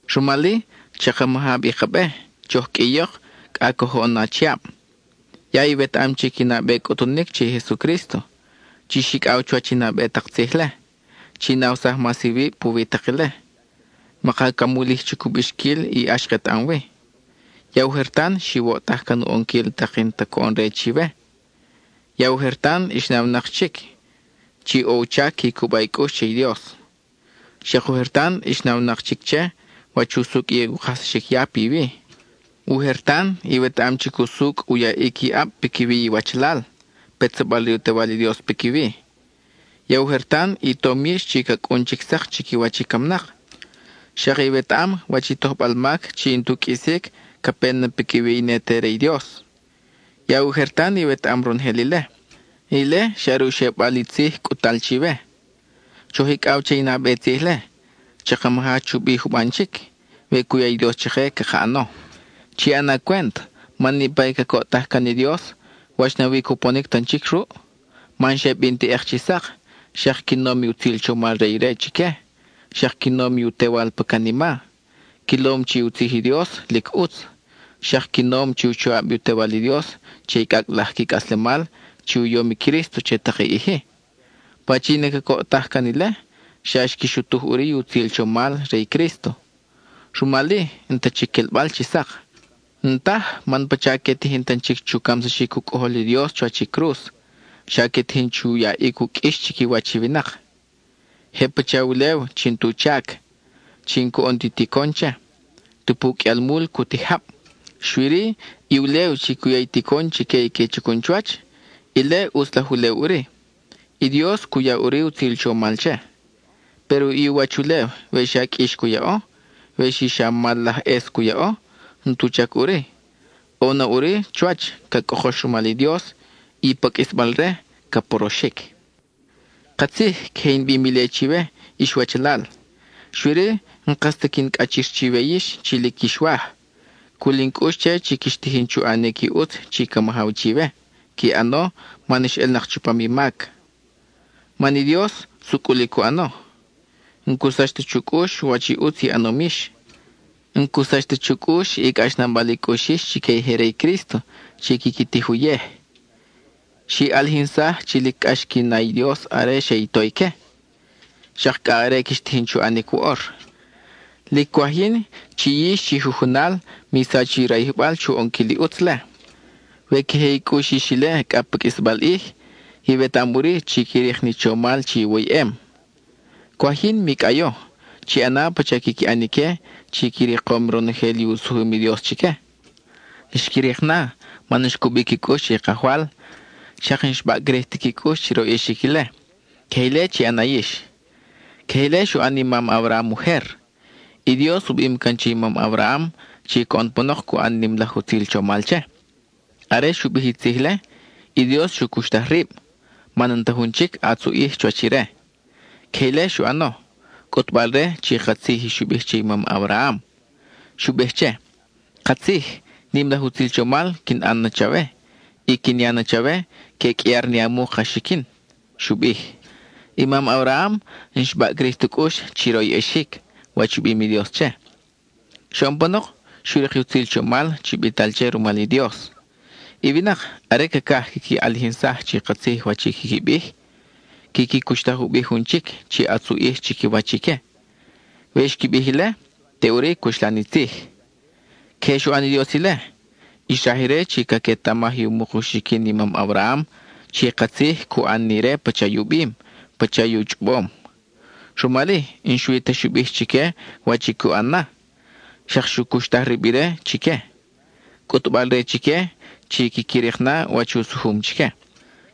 Rumal-i, chaka maja bi ka be; choj qʼuiyok cʼa coj oʼon na achiab. Ya iwetaʼam chic i nabe cʼutunic che i Jesucrísto; chix icʼaw chuwach i nabe tak tzij-le; chi nawsaj mas iwib puwi tak ile. Maka camulij chic u bixquil i ʼax ketaʼam wi. Ya ujer tan xiwoʼtaj can u ʼonquil tak i n-ta coʼon-re chiwe. Ya ujer tan ix nawnak chic chi ʼo u chac qui cuba i cʼux che i Dios. Xak ujer tan ix nawnak chic che wach usucʼ i u kajsaxic ya piwi. Ujer tan iwetaʼam chic usucʼ u yaʼic i ʼab piquiwi iwachalal, petsabal re u Tewal i Dios piquiwi. Ya ujer tan i tom yix chi ca cʼun chic sak chiquiwach i camnak; xak iwetaʼam wach i tojbal mac chi n-tu qʼuisic ca pe na piquiwi i ne te re i Dios. Ya ujer tan iwetaʼam ronojel ile. Ile xa are u xebal i tzij cʼut-tal chiwe. Choj icʼaw che i nabe tzij-le, chaka maja chubi juban chic, we cu ya i Dios chake caka ʼano. Chi ʼana cwent, man niʼpa i cacoʼtaj can i Dios ¿wach nawi i cuponic tan chic ruʼ? Man xe bin teʼek chi sak, xak qui nom i utzil chomal re ire chique, xak qui nom i u Tewal pa canima. Quilom chi u tzij i Dios, lic ʼutz. Xak qui nom i u choʼab i u Tewal i Dios che i cʼacʼ laj qui cʼaslemal chi u yom i Crísto che tak i ʼij-i. Pachin i cacoʼtaj can ile, xa xqui xutuj ʼuri i utzil chomal re i Crísto, rumal-i, n-ta chic quelbal chi sak. N-taj, man pacha que tijin tan chic chu camsaxic u Cʼojol i Dios chuwach i cruz, xa que tijin chu yaʼic u qʼuix chiquiwach i winak. Je pacha ulew chi n-tu chac, chi n-coʼon ti ticon che, tupu qʼuialmul cu tij jab. Xui-ri, i ulew chi cu ya i ticon chique i que chacun chuwach, ile ʼutz laj ulew ʼuri; i Dios cu ya ʼuri utzil chomal che. Péro i u wach ulew we xa qʼuix cu yaʼo, we xi xa mal laj ʼes cu yaʼo, n-tu chac ʼuri; ʼo na ʼuri chuwach ca cʼokox rumal i Dios, y pa qʼuisbal-re, ca poroxic. Katzij, queje in bim ile chiwe, ix wachalal, xui-ri n-kas ta quin cʼachir chiwe yix chi lic quix waj. Cul in cʼux che chi quix tijin chu ʼanic i ʼutz chi ca majaw chiwe; qui ʼano man ix ʼelnak chupam i mac. Man i Dios, sucʼul i cu ʼano. N-cu sach ta chu cʼux wach i ʼutz i ʼanom yix; n-cu sach ta chu cʼux i cʼaxnabal i cʼux yix chique i je re i Crísto chi quiqui tij uyej. Xi ʼalijinsaj chi lic cʼax qui na i Dios are xe i to ique. Xak cʼa are quix tijin chu ʼanic woʼor. Lic cwaj yin chi yix chi jujunal mi sach i rayijbal chu ʼonquil i ʼutz-le. We queje i cʼux yix ile cʼa pa qʼuisbal ʼij, iwetaʼam ʼuri chi qui rik ni chomal chi iwoyʼem. Cwaj yin mi cʼayo, chi ʼana pacha quiqui ʼan ique chi qui rikom ronojel i u sujum i Dios chique. Xqui rik na, man xcubi qui cʼux che i Kajwal, xak n-xbaʼcrij ti qui cʼux chi royʼexic ile. Queje ile chi ʼana yix. Queje ile xu ʼan i mam Abraham ujer. Dios u bim can che i mam Abraham chi coʼon panok cu ʼan nim laj utzil chomal che. Are xu bij i tzij-le, i Dios xu cuxtaj rib, man n-ta jun chic ʼatz u ʼij chuwach ire. Queje ile xu ʼano, cʼutbal-re chi katzij i xu bij che i mam Abraham. Xu bij che: “Katzij, nim laj utzil chomal quin ʼan na chawe y quin ya na chawe que qʼuiar ni a muk a xiquin,” xu bij. I mam Abraham n-xbaʼcrij tu cʼux chi royʼexic wach u bim i Dios che. Xoʼon panok, xu rik i utzil chomal chi bital che rumal i Dios. I winak, are cacaj quiqui ʼalijinsaj chi katzij wach i quiqui bij, quiqui cuxtaj u bi jun chic chi ʼatz u ʼij chiquiwach ique. We xqui bij ile, teʼuri cuxlan i tzij. Queje xu ʼan i Dios ile. Xraj ire chi caquetamaj i u muk u xiquin i mam Abraham chi katzij cu ʼan ni ire pacha i u bim, pacha i u chʼobom. Rumal-i, n-xui ta xu bij chique wach i cu ʼan na, xak xu cuxtaj rib ire chique, cʼutbal-re chique chi quiqui rik na wach u sujum chique.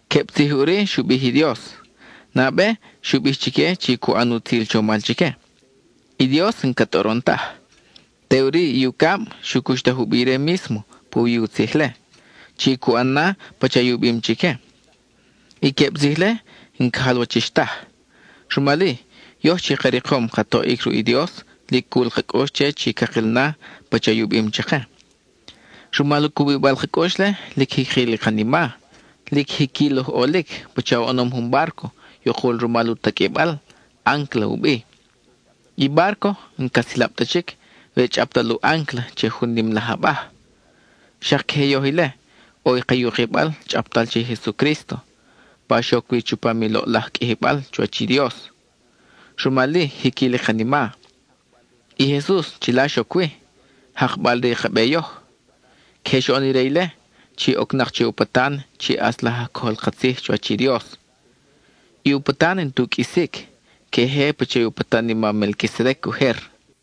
Queb tzij ʼuri xu bij i Dios. Nabe, xu bij chique chi cu ʼan utzil chomal chique; i Dios n-ca tʼoron taj. Teʼuri, i ucab, xu cuxtaj u bi ire mísmo puwi u tzij-le, chi cu ʼan na pacha i u bim chique. I queb tzij-le n-ca jalwachix taj. Rumal-i, yoj chi ka rikom ka toʼic ruʼ i Dios lic cul ka cʼux che chi cakil na pacha i u bim chake. Rumal u cubibal ka cʼux-le, lic jiquil i kanima. Lic jiquil oj ʼolic pacha oʼonom jun bárco yukul rumal u taqʼuibal, áncla u bi. I bárco n-ca silab ta chic we chʼaptal u áncla che jun nim laj abaj. Xak queje yoj ile: ʼo i ka yukibal chʼaptal che i Jesucrísto, pa xoc wi chupam i loʼlaj qʼuijibal chuwach i Dios, rumal-i jiquil i kanima. I Jesus chila xoc wi, jakbal re i ka be yoj. Queje xoʼon ire ile, chi ocnak che u patan chi ʼatz laj aj cojol ka tzij chuwach i Dios. I u patan n-tu qʼuisic, queje pacha i u patan i mam Melquisedec ujer.